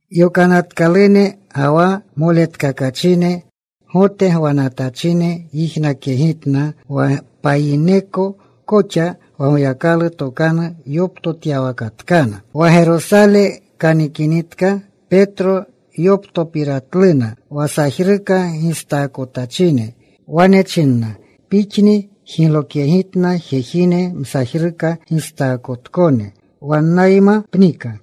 Yokanatkalune ga wa moletkakachine Gote gwanatachine yijnakyegitna wa payineko koxa wa Goyakalu tokanu yoptotyawakatkana. Wa Gerosale kanikinitka Petro, yoptopiratluna wa sajruka gistaakotachine. Wane chinna, “Pixni jiglokyegitna jejine msajruka gistaakotkone. Wannayma pnika.”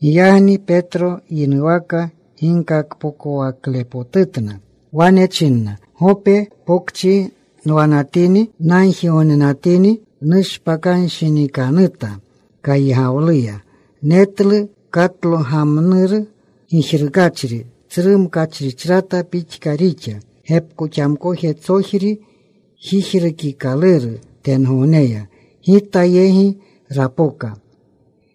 Giyagni Petro yinuwaka ginkakpokowaklepotutna. Wane china, “Gope Pokchi nwanatini, nagjigognenatini. Nushpakanshinikanuta. Kaygawleya netlu katlogamnuru gijrukachri. Tsru mkachrichrata pixka rixa. Gepkoxamkojetsojri jijrukikaluru tengogneya. Gita yegi rapoka.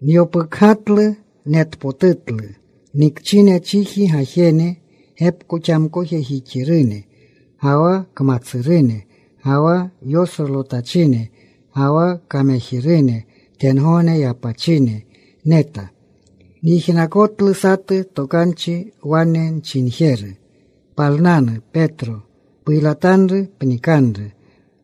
Nyopukgatlu. Netpotutlu. Nikchine chiji gajene gepkoxamkoojixirune, ga wa kmatsurune, ga wa yosrolotachine, ga wa kamejirune tengogne yapachine neta. Nyijnakotlu satu tokanchi wane nchinjeru, ‘Palnanu, Petro. Puylatanru. Pnikanru.’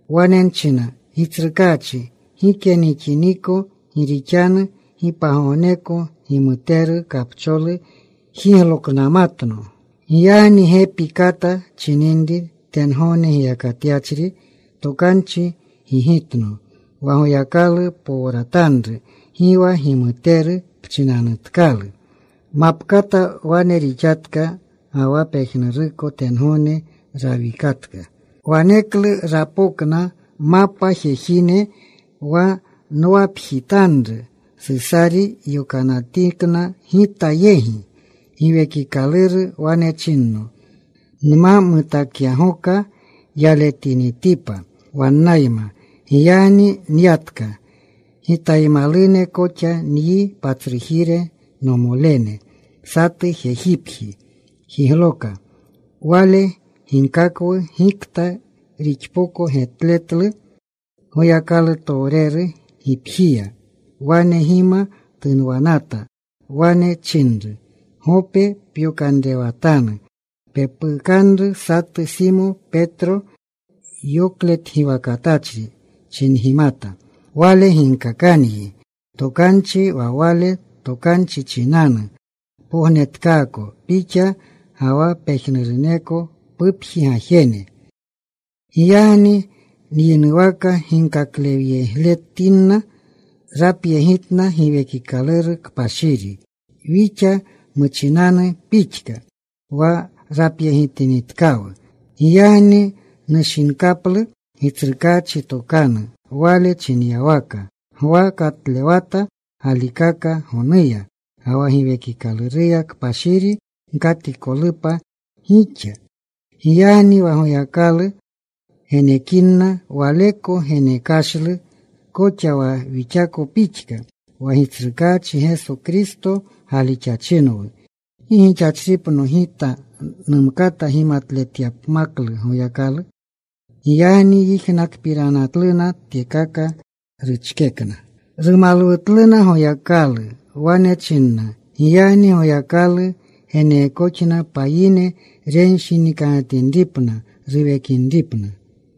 “Wane nchina, ‘Gitsrukaachi, gike nixiniko. Gi rixanu gi pagogneko gimuteru, kapcholu jigloknamatno.’ “Giyagni gepi kata chininri tengogne giyakatyachri tokanchi gigitno, ‘Wa Goyakalu powratanru gi wa gimuteru pchinanutkalu.’ “Mapkata wane rixatka, ga wa pejnuruko tengogne rawikatka. “Waneklu rapokna mapa jejine wa nwapjitanru. Susari yokanatikna gita yegi. Giwekikaluru wane chinno nma mutakyagoka yaletinitipa wannayma. Giyagni nyatka. Gitaymalune koxa nyi patsrujire nomolene. Satu jejipji wjigloka. Wale ginkakwu gikta rixpoko getletlu Goyakalutowreru gipjiya. Wane gima tunwanata. Wane chinru, ‘Gope pyokanrewatanu. Pepukanru satu Simo, Petro yoklegiwakatletachri,’ chingimata. ‘Wale ginkakanyi tokanchi, wa wale tokanchi chinanu pognetkaako pixa ga wa pejnuruneko pupji gajene.’ “Giyagni nyinuwaka ginkaklewyegletinna, rapyegitna Giwekikaluru Kpashiri wixa muchinanu pixka, wa rapyegitinitkawu. Giyagni nushinkaplu Gitsrukaachi tokanu. Wale chinyawaka, ‘Gwa katlewata galikakni gonuya, ga wa Giwekikaluru Kpashiri gkatikolupa gixa.’ Giyagni wa Goyakalu renekinna waleko genekashlu koxa wa wixako pixka, wa Gitsrukaachi Geso Kristo galixachinwu, ¿gi gixachripno gita numkata gimaletletyapmaklu Goyakalu?” Giyagni yijnakpiranatluna tyekaka, ruchkekna. Rumalwutluna Goyakalu. Wane china, “Giyagni Goyakalu geneekoxna payine renshinikanutinripna, ruwekinripna.”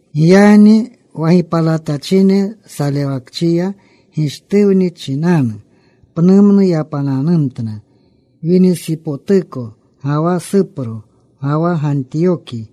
Giyagni wa gipalatachine salewakchiya Gishtuwni chinanu, pnumnu yapananumtna, Winisipotuko ga wa Supro, ga wa Gantiyoki.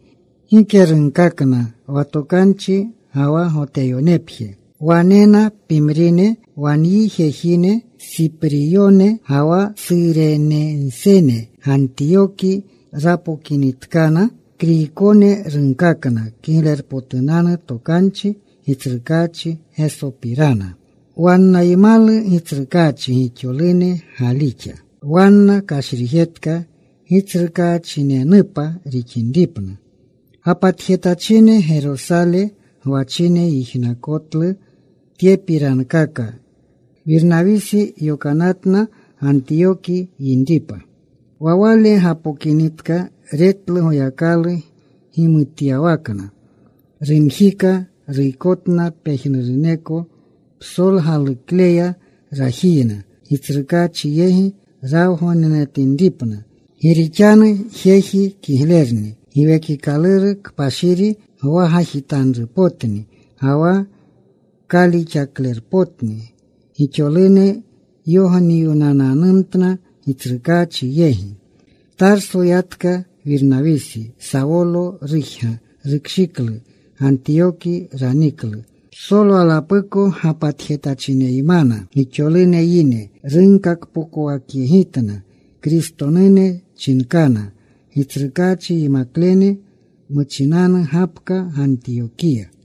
Gike runkakna wa tokanchi, ga wa Goteyonepje. Wanena pimrine wa nyi jejine Supriyone ga wa Surenensene, Gantiyoki rapokinitkana. Kriykone runkakna Kiglerpotunanu Tokanchi Gitsrukaachi Gesopirana. Wannaymalu Gitsrukaachi. Gixolune galixa. Wanna kashrijetka Gitsrukaachinunepa rixinripna. Gapatjetachine Gerosale gwachine yijnakotlu tyepirankaka. Wirnawisi yokanatna. Gantiyoki yinripa. Wa wale gapokinitka, retlu Goyakalu gimutyawakna. Rumjika. Ruykotna pejnuruneko psolgalukleya rajiyna Gitsrukaachi yegi rawgognenatinripna. Gi rixanu jeji kiglerni. Giwekikaluru Kpashiri gwagajitanrupotni ga wa kalixaklerpotni. Gixolune yogniwnananumtna Gitsrukaachi yegi. Tarso yatka Wirnawisi. Sawolo rujga. Rukshiklu. Gantiyoki raniklu. Psolwalapuko gapatjetachineymana. Gixolune yine runkakpokowakyegitna. Kristonune chinkana Gitsrukaachi yimaklene muchinanu gapka Gantiyokiya.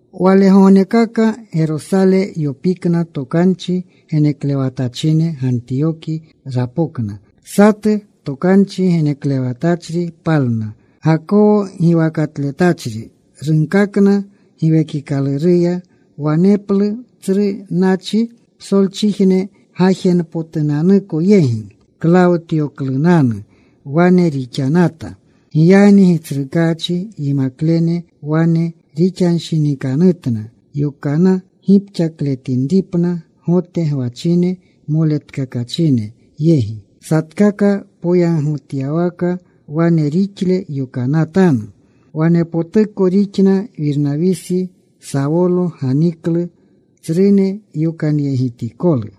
Walegognekaka Gerosale yopikyana tokanchi geneklewatachine. Gantiyoki rapokna. Satu tokanchi geneklewatachri palna. Gakawo giwakatletachri. Runkakna Giwekikaluruya waneplu tsru nachi psolchijne gajenpotunanuko yegi. Klawtyoklunanu wane rixanata. Giyagni Gitsrukaachi yimaklene wane rixanshinikanutna yokana gipxakletinripna Gote gwachine moletkakachine yegi. Satkaka poyagotyawaka wane rixle yokanatanu. Wanepotuko rixna. Wirnawisi, Sawolo ganiklu tsrune yokanyegitikolu.